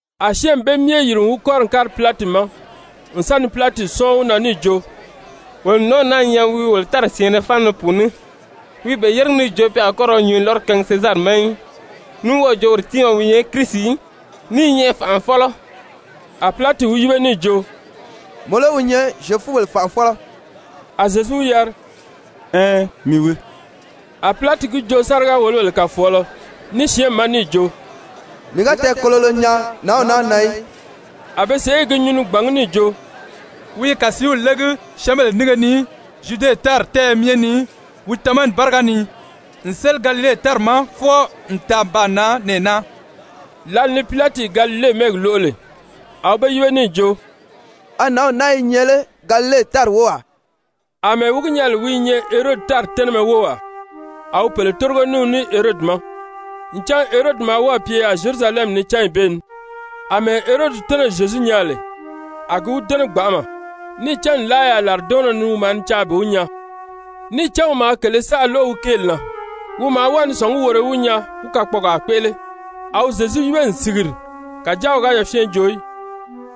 A syɛ́ɛnmi bee myɛ yìri n wi kɔ́ri n kári Pilati ma n sa ni Pilati sɔ́ɔn wi na níì jo: «Wolo n nǎnw naa nyaa wi i wolo tári syɛ̀ɛnnɛ fáana ni pùuní, wi i be yéregi níì jo pe a kɔ́ ra nyǔnyi lɔ́rɔ kaangi Sezari ma í, ní wɔ́ɔ̀ jo woro tiimaa wi nyɛ Kirisi, ní i nyɛ fànʔafɔlɔ.» A Pilati wi yíbe níì jo: «Mɔ lé wi nyɛ Zyefubèle fànʔafɔlɔ?» A Zyezu wi yari: «Ɛɛn, mii wii.» A Pilati gi joo sáriga-wòlobèle kàfɔɔlɔ ní syɛ́ɛnmi ma níì jo: «Mii ga tɛɛkololo nyaa nǎnw naa na í.» A be sèʔé i gi nyuu ni gbàngí níì jo: «Wi i kàsiiw légi syɛ́ɛnbèle nínge ni Zyude tári tɛ́ɛyɛ myɛ ni wi tamani báriga ni, n séli Galile tári ma fwɔɔ n taa n baa nan nɛɛ naa.» Lǎli ni Pilati Galile mɛ́ɛgi lóʔo lè, a wi be yíbe níì jo: «A nǎnw naa i nyɛ lé Galile tári wówaa?» Amɛɛ wi gi nyaa lè wi i nyɛ Herodi tári tɛ́nɛmɛ wówaa, a wi pèle tórigo ní wi ní Herodi ma, ncan Herodi maa wɔ́ɔ̀ pye yaà Zyerusalɛmi ni cányi bee ni. Amɛɛ Herodi tɛ́nɛ̀ Zyezu nyaa lè, a gi wi dɛ́nɛ gbanʔama. Níì cán nlaa yaà làridɔɔnnɔ ni wi maa ni caa bi wi nyaa, níì cán wi maa kèlē saʔa lóʔo wi kéeli na, wi maa wɔ́ɔ ni sɔ̀ngí woro í wi nyaa wí kakpɔɔgaa kpéʔele. A wi Zyezu yíbe n sìgiri, kàjáa wi ga yafyɛn joo í.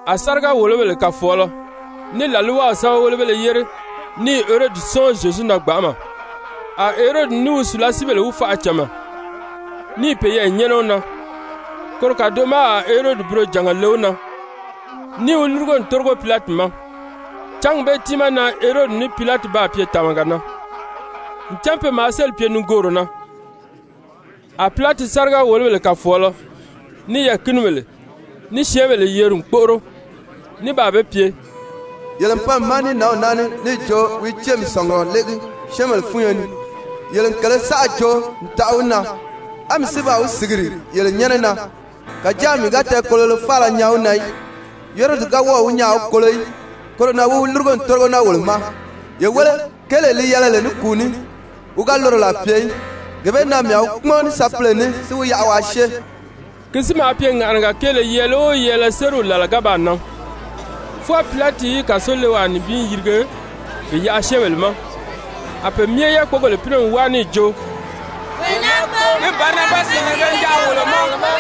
A sáriga-wòlobèle kàfɔɔlɔ ní làlwaw sɛ́bɛwelebéle yére ní i Herodi sɔ́ɔn Zyezu na gbanʔama. A Herodi ní wi sùlasiibèle wi faʔa cama, ní i peyɛɛ nyɛ́nɛ wi na. Koro kàdoʔo ma a Herodi burojànga le wi na níì wi lúrugo n tórigo Pilati ma. Cángi bee tiimaa na Herodi ní Pilati baa pye tàmaga na, ncan pe maa sélì pye nigooro na. A Pilati sáriga-wòlobèle kàfɔɔlɔ, ní yɛɛ̀kinibèle, ní syɛ́ɛnbèle yeri n kpóʔoro ní baa be pye: «Yele n pan mii ma ní nǎnw naa ní níì jo wi i céemi sɔ̀ngurɔ légi syɛ́ɛnbèle fúnyo ni. Yele n kèlē saʔa joo n taʔa wi na, á mii si baa wi sìgiri yele nyɛ́nɛ na, kàjáa mii ga tɛɛkololo faala nyaa wi na í. Herodi ga wɔ́ɔ̀ wi nyaa a wi kolo í, koro na wi wi lúrugo n tórigo naa wolo ma, ye wéle, kéelee li yɛlɛ lè ní kùu ní, wi ga loro làa pye í. Gee bee na mii a wi kpúmɔn ní sapile ní si wi yaʔa waa syée.» [Ki si maa pye ŋàʔanaga kéele yɛɛlɛ o yɛɛlɛ sériw làla ga baa nan, fwɔɔ Pilati í kàsolewaa nibin yirige bi yaʔa syɛ́ɛnbèle ma.] A pe myɛ yákpogèle pínɛ n wáa níì jo: «Wee naa kpóo, mí Barabasi yirige mi yaʔa wolo ma.»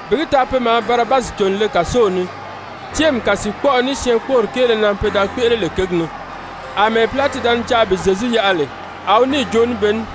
Bi gi taa pe maa Barabasi cò n le kàsow ni céemi kàsiikpɔʔɔ ní syɛɛnkpoori kéele na pe da kpéʔele lè kěgi ni. Amɛɛ Pilati da ni caa bi Zyezu yaʔa lè, a wi níì joo ní be ní.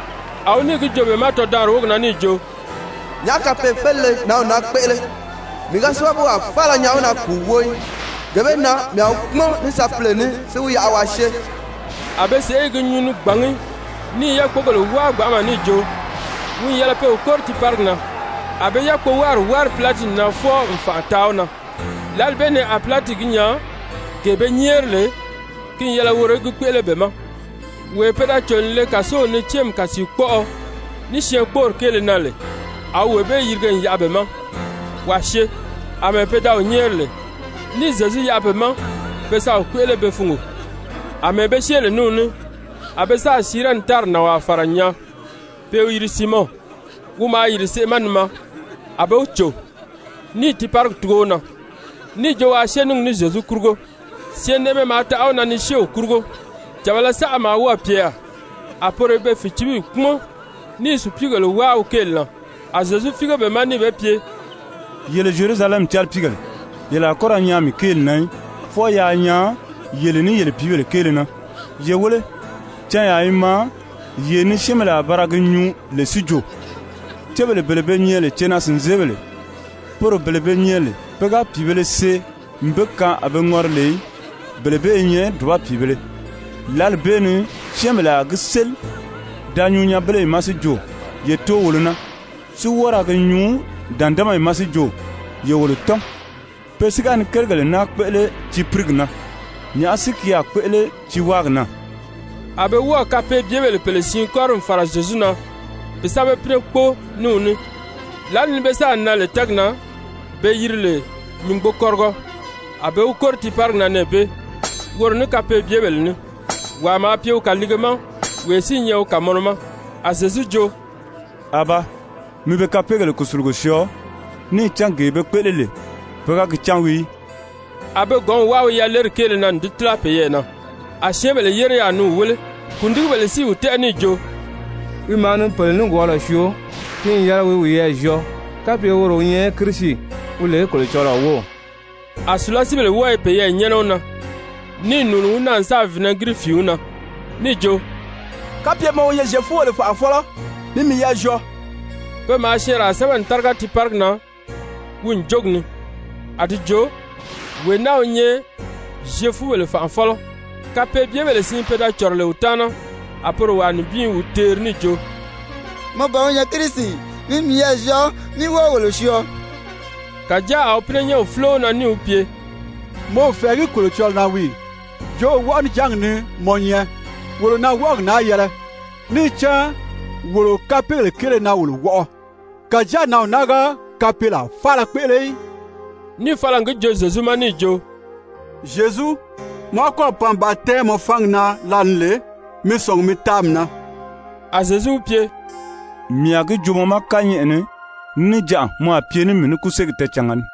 A wi níì gi joo be ma tɔdaanri wógi na níì jo: «Nyàʔá kapee-félile nǎnw naa kpéʔele? Mii ga sábabuwaa faala nyaa wi na kùu wóo í. Gee bee na mii a wi kpúmɔn ní sapile ní si wi yaʔa waa syée.» A be sèʔé i gi nyuu ni gbàngí ní i yákpogèle wáa gbanʔama níì jo, wi n yɛlɛ pe wi kóri tiiparigi na. A be yákpowáari wári Pilati na fwɔɔ n fànʔa taa wi na. Lǎli bee ni a Pilati gi nyaa gee be nyɛ́ɛri lè, ki n yɛlɛ woro í gi kpéʔele be ma. Wee pe da cò n le kàsow ni céemi kàsiikpɔʔɔ, ní syɛɛnkpoori kéele na lè, a wi wee bee yirige n yaʔa be ma waa syée àmɛɛ pe da wi nyɛ́ɛri lè, níì Zyezu yaʔa be ma pe sa wi kpéʔele be fungo. Amɛɛ be syée lè ní wi ní, a be sáà Sirɛni tári nànwaa fàra n nyaa pe i wi yiri Siimɔn, wi maa yìri seʔe ma ni maa, a be wi cò, níì tiiparigi tugo wi na níì jo waa syée ní gi ní Zyezu kurugo. Syɛɛnnɛʔɛmɛ maa taʔa wi na ni syée wi kurugo. Càbala saʔa maa wɔ́ɔ̀ pye yaà, a poro i be fìcibiyi kpúmɔn, ní i sùpiigèle wáa wi kéeli na. A Zyezu fíige be ma níì be pye: «Yele Zyerusalɛmi calipiigèle, yele a kɔ́ ra nyaan mii kéeli na í, fwɔɔ yaa nyaan yele ní yele pìíbèle keele na. Ye wéle, canyaa i maa yee ni syɛ́ɛnbèle a ba ra gi nyuu lè si jo: ‹Cébèle bele be nyɛ lè cenaa-sìnzeebèle, poro bele be nyɛ lè pe ga pìibēle see n be kaan a be ŋɔri lè í, bele bee i nyɛ dùba pìibēle.› Lǎli bee ni syɛ́ɛnbèle a gi séli da nyuu nyanbeleyi ma si jo: ‹Ye too wolo na,› si wɔ́ɔ ra gi nyuu dǎndamayi ma si jo: ‹Ye wolo tɔ́n.› Pe si ga ni kérigèle naa kpéʔele tiipirigi na, nyàʔá si ki a kpéʔele tiiwaagi na?» A be wɔ́ɔ̀ kapeebyebèle pèle siin kɔ́ri n fàra Zyezu na bi sa be pínɛ kpóo ní wi ní. Lǎli ni be sáà nan lè tɛ́ɛgi na be yiri lè Nyùngbokɔrigɔ, a be wi kóri tiiparigi na nɛɛ bee, woro ní kapeebyebèle ní. Wàa maa pye wi kàliige ma wee si i nyɛ wi kàmɔnɔ ma. A Zyezu jo: «Abaa, mi be kapeegèle kùsulugo syɔɔ, níì cán gee be kpéʔele lè pe ga gi cán wii í.» A be gɔ̌nw wáa wi yaleri kéele na n di tíla peyɛɛ na. A syɛ́ɛnbèle yére yaà ni wi wéle. Kùndigibèle si i wi tɛ́ʔɛ níì jo: «Wi maa ni pèle nikwɔɔlɔ syoo, ki n yɛlɛ wi wiyɛɛ zyɔɔ kapye woro wi nyɛ Kirisi, wi lè Kolocɔlɔɔ wów.» A sùlasiibèle wɔ́ɔ i peyɛɛ nyɛ́nɛ wi na, níì nùuni wi na n sáà vinɛgiri fìin wi na níì jo: «Kapye mɔ wi nyɛ Zyefubèle fànʔafɔlɔ, mi miyɛɛ zyɔɔ.» Pe maa syɛɛnraa sɛ́bɛ n táriga tiiparigi na wi ǹjogi ni, a di jo: WEE NAA WI NYƐ ZYEFUBELE FANʔAFƆLƆ. Kapeebyebèle siin pe da cɔ̀rɔ lè wi taana, a poro wàa nibin i wi teeri níì jo: «Mɔ ban wi nyɛ Kirisi ì? Mi miyɛɛ zyɔɔ, mí wɔ́ɔ wolo syɔɔ.» Kàjáa a wi pínɛnyɛnw fúlo wi na níì wi pye: «Mɔ o fɛ̀ɛgí Kolocɔlɔɔ na wii ì? Jo wɔʔɔnijangi ni mɔ nyɛ. Wolo na wɔʔɔgi naa yɛlɛ, níì cán wolo kapeegèle kéele na wolo wɔʔɔ. Kàjáa nǎnw naa ga kapeelaa faala kpéʔele í.» Níì fala n gi joo Zyezu ma níì jo: «Zyezu, mɔ ga kɔ́ɔ̀ pan bi ba tɛ́ɛn mɔ fangi na lǎli ni lè, mi sɔ̀ngi mi taa mii na.» A Zyezu wi pye: «Mii a gi joo mɔ ma kányɛʔɛ ni, níjanʔa mɔ a pye ní mii ní kúsegi tɛɛcànga ni.»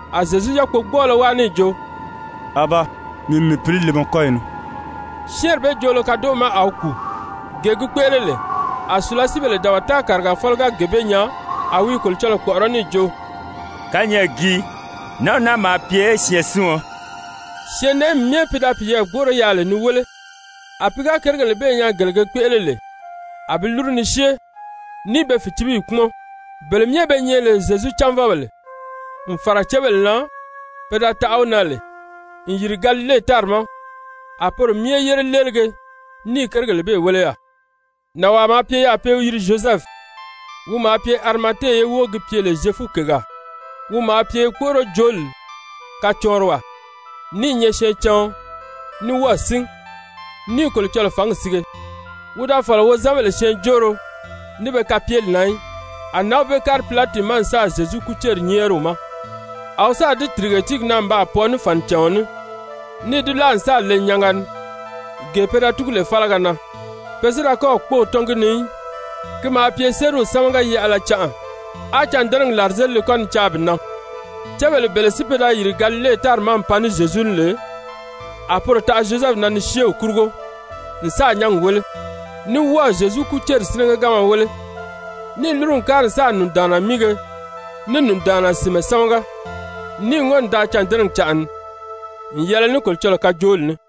A Zyezu yákpogbɔɔlɔ wáa níì jo: «Abaa, mii n mii pǐli le mɔ kɔ́yi ni.» Syɛ́ɛnri bee joolo kadoʔo ma a wi kùu. Gee gi kpéʔele lè, a sùlasiibèle dabata kàrigafɔlɔ ga gee bee nyaa, a wi i Kolocɔlɔɔ kpɔ̀ʔɔrɔ́ níì jo: «Kányɛʔɛ gii, nǎnw naa maa pye syɛɛnsiɔn.» Syɛɛnnɛʔɛmi myɛ pi da piyɛɛ gbóʔoro yaà lè ni wéle, a pi ga kérigèle bee nyaa gele ge kpéʔele lè, a bi lúru ni syée ní i be fìcibiyi kpúmɔn. Bele myɛ be nyɛ lè Zyezu cánvɔbèle, n fàra cébèle na pe da taʔa wi na lè n yìri Galile tári ma, a poro myɛ yére léelige ní i kérigèle bee wéle yaà. Nànwaa maa pye yaà pe i wi yiri Zyozɛfu, wi maa pye Arimate ye wóo gi pye lè Zyefukègaa, wi maa pye kpóʔorojooli kacɔɔnriwaa, ní i nyɛ syɛɛncaɔn, ní wɔ́ɔ̀ sín, ní i Kolocɔlɔɔ fǎngi sige. Wi da fɔ̀lɔ wozanbèle syɛɛnjóoro, ní be kapyeli na í. A nǎnw bee kári Pilati ma n sáà Zyezu kúceri nyɛ́ɛri wi ma. A wi sáà di tìrige tíigi na n baa pwɔɔ ní fànicàɔn ní, níì di láa n sáà le nyanga ni, gee pe da túgu lè fálaga na, pe si da kɔ́ɔ̀ kpóō tɔ́n gi ni í. Ki maa pye sériw sámaga-yaʔala canʔa, á cândɛnɛgi làrizelile kɔ́ ni caa bi nan. Cébèle bele si pe da yìri Galile tári ma n pan ní Zyezu ní lè, a poro taʔa Zyozɛfu na ni syée wi kurugo n sáà nyángi wéle, ní wɔ́ɔ̀ Zyezu kúceri sínɛgɛganma wéle, níì lúru n kári n sáà nùndaanna míige ní nùndaanna sìnmɛ sámaga. Níì ŋɔ́n n daa cândɛnɛgi canʔa ni, n yɛlɛ ní Kolocɔlɔɔ kajooli ní.